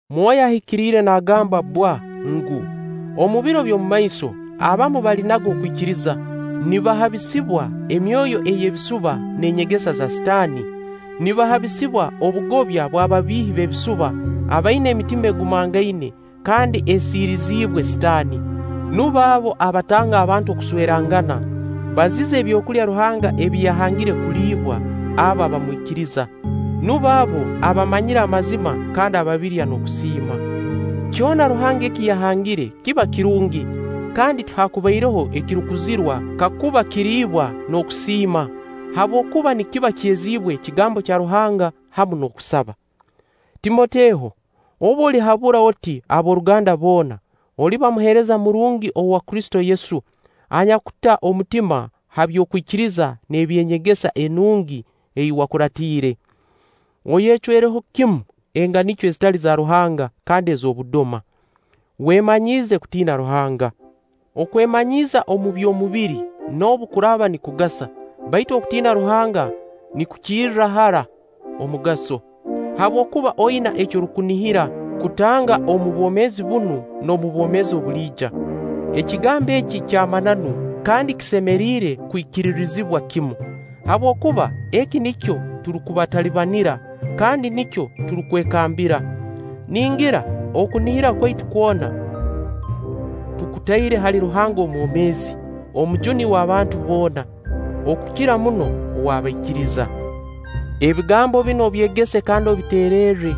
Mwoyo Ahikiire nagamba bbwa ngu, omu biro eby'omumaiso abamu balinaga okwikiriza, nibahabisibwa emyoyo ey'ebisuba n'enyegesa za Sitaani, nibahabisibwa obugobya bw'ababiihi b'ebisuba abaina emitima egumangaine kandi esiiriziibwe Sitaani. Nubo abo abatanga abantu okuswerangana, baziza ebyokulya Ruhanga ebi yahangire kuliibwa abo abamwikiriza. Nubo abo abamanyire amazima kandi ababirya n'okusiima. Kyona Ruhanga eki yahangire kiba kirungi kandi tihakubaireho ekirukuzirwa kakuba kiriibwa n'okusiima; habwokuba nikiba kyeziibwe ekigambo kya Ruhanga hamu n'okusaba. Timoteho, obu olihabura oti ab'oruganda boona, oliba muheereza murungi owa Kristo Yesu anyakuta omutima ha by'okwikiriza n'eby'enyegesa enungi ei wakuraatiire. Oyecwereho kimu enganikyo ezitali za Ruhanga kandi ez'obudoma. Wemanyiize kutiina Ruhanga. Okwemanyiiza omu by'omubiri, noobu kuraaba nikugasa; baitu okutiina Ruhanga nikukirra hara omugaso; habwokuba oina eki orukunihira kutanga omu bwomeezi bunu n'omu bwomeezi obuliija. Ekigambo eki kya mananu kandi kisemeriire kwikiririzibwa kimu. Habwokuba eki nikyo turukutalibanira kandi nikyo turukwekambira. Ningira okunihira kwaitu kwona tukutaire hali Ruhanga Omwomeezi, Omujuni w'abantu boona, okukira muno ow'abaikiriza. Ebigambo binu obyegese kandi obiteererre.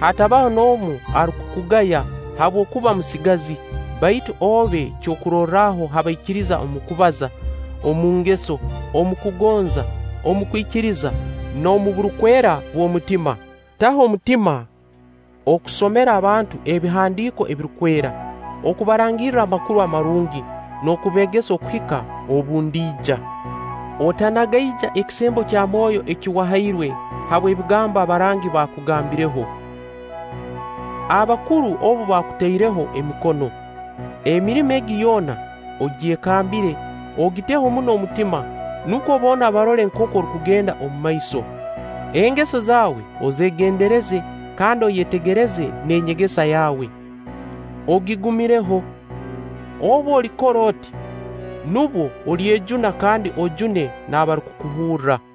Hatabaho n'omu arukukugaya habw'okuba musigazi, baitu obe kyokurorraho ha baikiriza omu kubaza, omu ngeso, omu kugonza, omu kwikiriza, n'omu burukwera bw'omutima. Taho omutima okusomera abantu Ebihandiiko Ebirukwera, okubarangirra Amakuru Amarungi n'okubeegesa okuhika obu ndiija. Otanagaija ekisembo kya Mwoyo eki wahairwe habw'ebigambo abarangi bakugambireho, abakuru obu baakutaireho emikono. Emirimo egi yoona ogyekambire, ogiteho muno omutima, nukwo boona barole nkooku orukugenda omu maiso. Engeso zaawe ozeegendereze kandi oyetegereze n'enyegesa yawe; ogigumireho. Obu olikora oti, nubwo olyejuna kandi ojune n'abarukukuhurra.